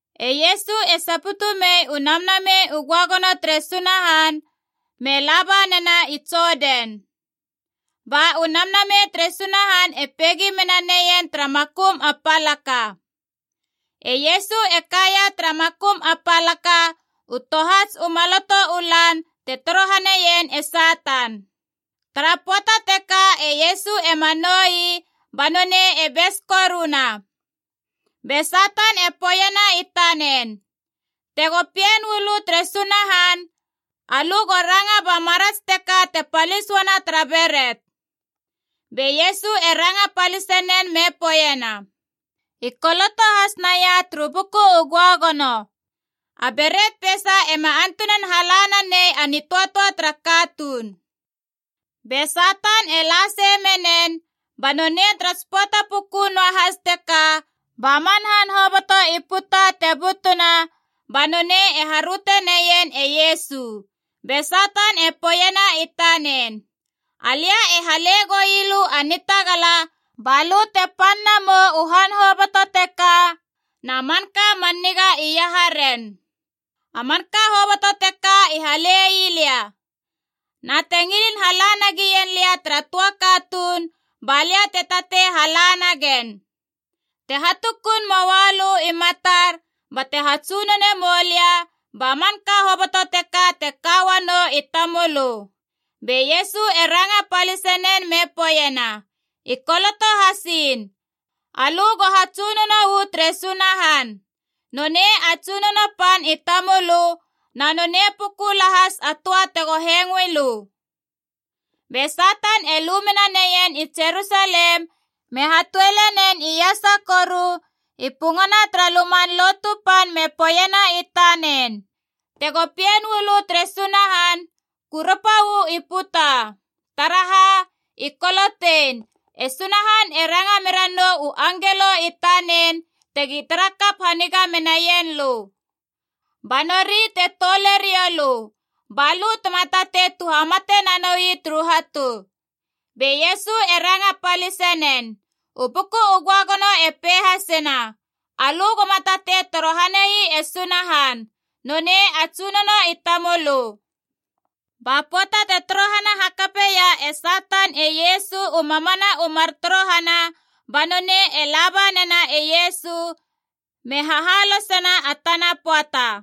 E Iesu e saputu mei u Namnamei u Göagono tere Sunahan me laba nena i Jodan. Ba u Namnamei tere Sunahan e peigi mena neien tara makum a palaka. E Iesu e kaia tara makum a palaka u tohats u maloto u lan te torohaneien e Satan. Tara pöata teka e Iesu ema nou ii, ba nonei e bes koruna. Be Satan e poeiena i tanen, “Tego Pien uu lö tere Sunahan, alö go ranga ba marats teka te palis uana tara beret!” Be Iesu e ranga palise nen me poeiena, “I koloto has naia turu Buku u Göagono, ‘A beret peisa ema antunan hala nanei a nitöatöa tara katuun.’” Be Satan e la sei menen, ba nonei tara tsi pöata puku noahas teka ba man han hoboto i puta te butuna ba nonei e haröteneien e Iesu. Be Satan e poeiena i tanen, “Alia e hale goui lö a nitagala balö te pan na mou u han hoboto teka, na manka man niga iaharen. A manka hoboto teka i halei lia. Na te ngilin hala nagien lia tara töa katuun, ba lia te tatei hala nagen. Te hatukun moa lö i matar bate hatsunone moulia, ba manka hoboto teka te ka uanou i tamölö!” Be Iesu e ranga palise nen me poeiena, “I koloto hasiin, ‘Alö go hatsunono uu tere Sunahan. Nonei a Tsunono pan i tamölö, na nonei puku lahas a töa tego hengoei lö.’” Be Satan e lu mena neien i Jerusalem me hatuole nen iasa koru i pungana tara Luman Lotu Pan me poeiena i tanen, “Tego Pien uu lö tere Sunahan, kurapa uu i puta. Taraha? I kolotein: ‘E Sunahan e ranga mera nou u angelo i tanen tegi tara kap haniga menaien lö. Ba nori te toule riou lö, ba lö tema tatei tuhamate nanoui turu hatu.’” Be Iesu e ranga palise nen, “U Buku u Göagono e pei hasena, ‘Alö goma tatei torohane ii e Sunahan. Nonei a Tsunono i tamölö.’” Ba pöata te torohana hakapeia e Satan e Iesu u mamana u mar torohana, ba nonei e laba nena e Iesu me hahalosena a tana pöata.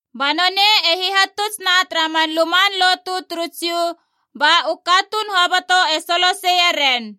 Ba nonei e hihatutsna tara man luman lotu turu Jiu, ba u katuun hoboto e soloseie ren.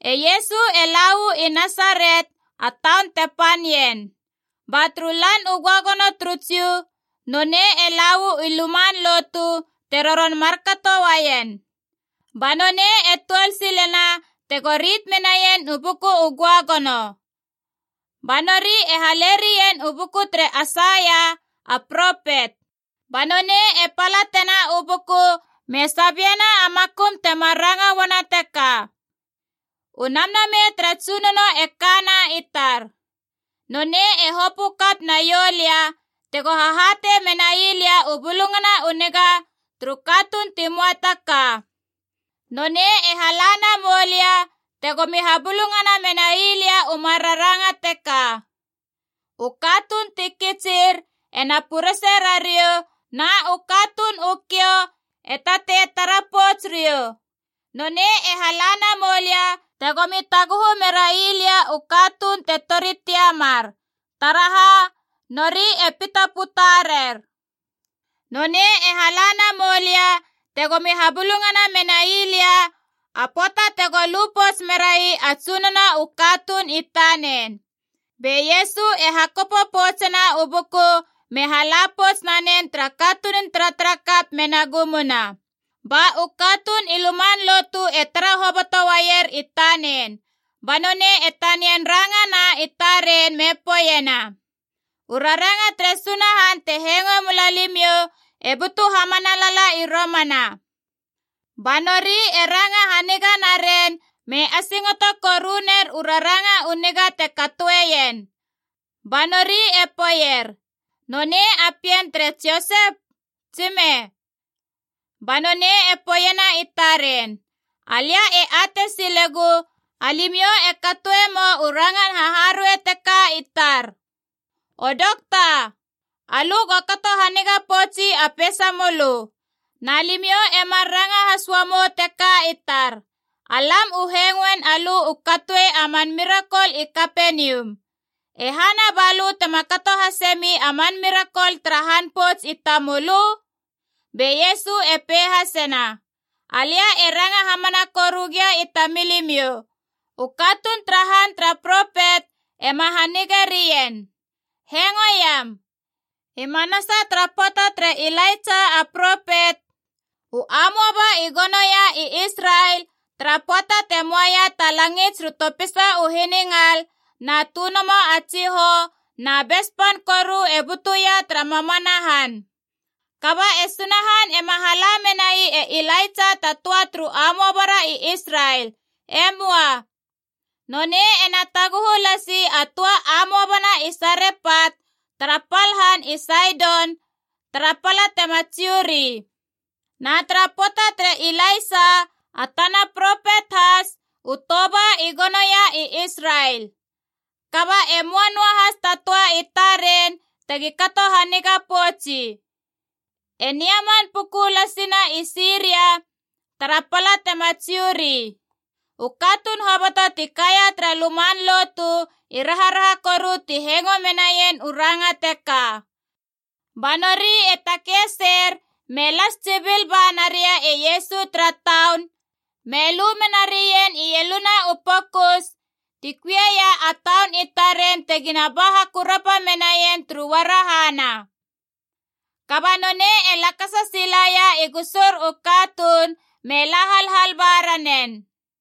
E Iesu e la uu i Nasaret, a taun te pan ien. Ba turu Lan u Göagono turu Jiu nonei e la uu i luman lotu, te roron markato uaien. Ba nonei e tuol silena tego rit menaien u Buku u Göagono. Ba nori e halerien u buku tere Aisaia, a propet. Ba nonei e palatena u buku me sabiena a makum temar ranga uana teka, “U Namnamei tara Tsunono e kana i tar. Nonei e hopö kap naiou lia tego hahatei menai lia u Bulungana u Niga turu katuun ti möa ta ka. Nonei e hala namou lia tegomi habulungana menai lia u mar raranga teka: U katuun ti kitsir ena purese rariou, na u katuun u kiou e tatei tara pouts riou. Nonei e hala namou lia tegomi taguhu merai lia u katuun te tori tiamar. Taraha? Nori e pita puta rer. Nonei e hala namou lia tegomi habulungana menai lia a pöata tego lu pouts merai a Tsunono u katuun i tanen.” Be Iesu e hakopo poutsena u buku me hala pouts nanen tara katunun taratarakap mena gumuna. Ba u katuun i luman lotu e tara hoboto uaier i tanen. Ba nonei e tanian rangana i taren me poeiena, “U raranga tere Sunahan te hengoe mula limiou e butu hamana lala i romana!” Ba nori e ranga haniga naren me asingoto koru ner u raranga u niga te katoeien. Ba nori e poeier, “Nonei a pien tere Josep, tsime?” Ba nonei e poeiena i taren, “Alia e atei silegu alimiou e katoe mou u rangan haharuei teka i tar, ‘O dokta, alö go kato haniga poutsi a peisamölö.’ Na limiou emar ranga has uamou teka i tar: ‘Alam u hengoin alö u katoe a man mirakol i Kapenium. E hana ba lö tema kato hasemi a man mirakol tara han pouts i tamulö?’” Be Iesu e pei hasena, “Alia e ranga hamana koru gia i tamilimiou, u katuun tara han tara propet ema hanige rien. Hengoiam. I manasa tara pöata tere Ilaitsa a propet, u amoaba i gonoia i Israel, tara pöata te möaia ta langits turu topisa u hiningal na tönomo a tsihou, na bes pan koru e butuia tara mamana han. Kaba e Sunahan ema hala menai e Ilaitsa ta töa turu amoaba ra i Israel. E möa. Nonei ena taguhu lasi a töa amoaba na i Sarepat, tara pal han i Saidon, tara pala tema Jiu ri. Na tara pöata tere Ilaisa, a tana propet has, u toba i gonoia i Israel. Kaba e möa noa has ta töa i taren tegi kato haniga poutsi. E Neaman puku lasi na i Siria, tara pala tema Jiu ri.” U katuun hoboto ti kaia tara luman lotu i raharaha koru ti hengo menaien u ranga teka. Ba nori e takei seir me las tsibil ba naria e Iesu tara taun, me lu mena rien ieluna u pokus ti kuieia a taun i taren tegina ba hakurapa menaien turu uarahana. Kaba nonei e lakasa silaia i gusur u katuun me la halhal ba ranen.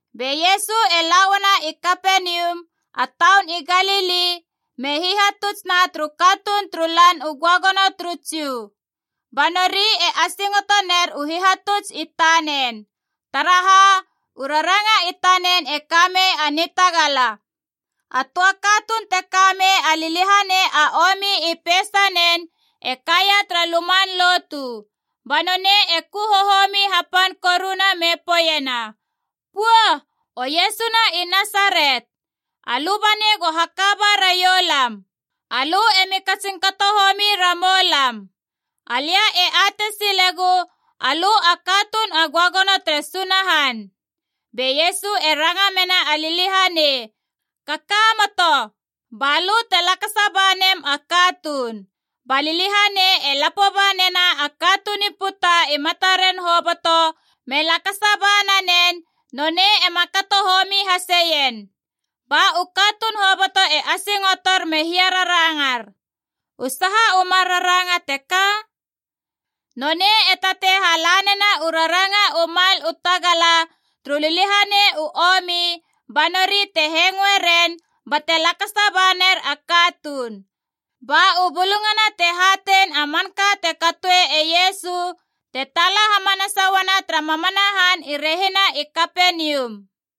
Be Iesu e la uana i Kapenium, a taun i Galili, me hihatuts na turu katuun turu Lan u Göagono turu Jiu. Ba nori e asingoto ner u hihatuts i tanen. Taraha? U raranga i tanen e ka mei a nitagala. A töa katuun te ka mei a liliahanei a omi i peisanen e kaia tara luman lotu. Ba nonei e ku hohomi hapan koruna me poeiena, “Pua! O Iesu na i Nasaret, alö banei go haka ba raiou lam! Alö emi katsin kato homi ramou lam! Alia e atei silegu alö a Katuun a Göagono tere Sunahan!” Be Iesu e ranga mena a liliahanei, “Kakamoto, ba lö te lakasa ba nem a katuun!” Ba liliahanei e lapo ba nena a katuun i puta i mataren hoboto, me lakasa ba nanen, nonei ema kato homi haseien. Ba u katuun hoboto e asingotor me hiararangar, “U saha u mar raranga teka? Nonei e tatei hala nena u raranga u mal u tagala turu liliahanei u omi, ba nori te hengoe ren bate lakasa ba ner a katuun!” Ba u bulungana te hatein a manka te katoe e Iesu te taala hamanasa uana tara mamana han i rehina i Kapenium.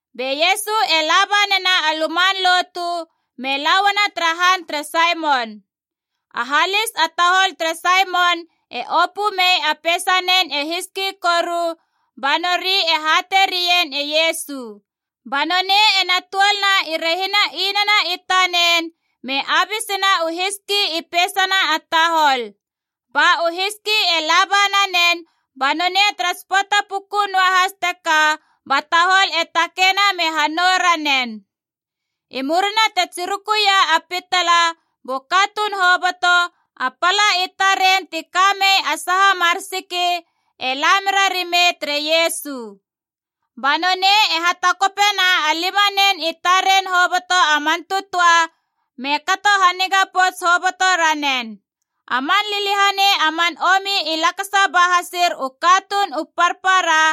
Be Iesu e laba nena a luman lotu me la uana tara han tere Saimon. A halis a tahol tere Saimon e opö mei a peisanen e hiski koru, ba nori e hatei rien e Iesu. Ba nonei ena tuolna i rehina inana i tanen, me abisena u hiski i peisana a tahol. Ba u hiski e laba nanen, ba nonei tara tsi pöata puku noahas teka ba tahol e takeina me hanou ranen. I murina te tsirukuia a pitala bu katuun hoboto, a pala i taren ti ka mei a saha mar siki e la mera rimei tere Iesu. Ba nonei e hatakopena a limanen i taren hoboto a man tötöa me kato haniga pouts hoboto ranen. A man liliahanei a man omi i lakasa ba hasir u katuun u parpara,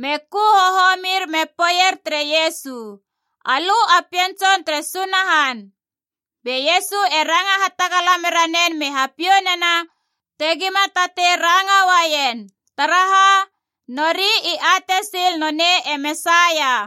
me ku hohomir me poeier tere Iesu, “Alö a Pien Tson tere Sunahan!” Be Iesu e ranga hatagala mera nen me hapiou nena tegima tatei ranga uaien. Taraha? Nori i atei sil nonei e Mesaia.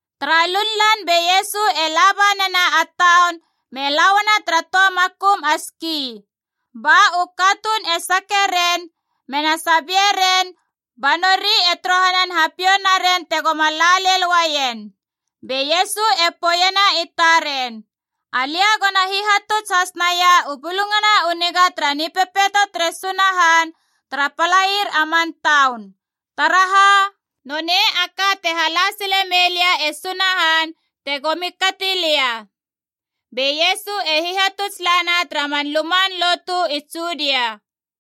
Tara lunlan be Iesu e laba nena a taun me la uana tara töa makum a ski. Ba u katuun e sake ren, mena sabieren ba nori e torohanan hapiou naren tegoma la lel uaien. Be Iesu e poeiena i taren, “Alia gona hihatuts has naia u Bulungana u Niga tara Nipepeito tere Sunahan tara palair a man taun. Taraha? Nonei a ka te hala sile mei lia e Sunahan tegomi kati lia.” Be Iesu e hihatuts lana tara man luman lotu i Judia.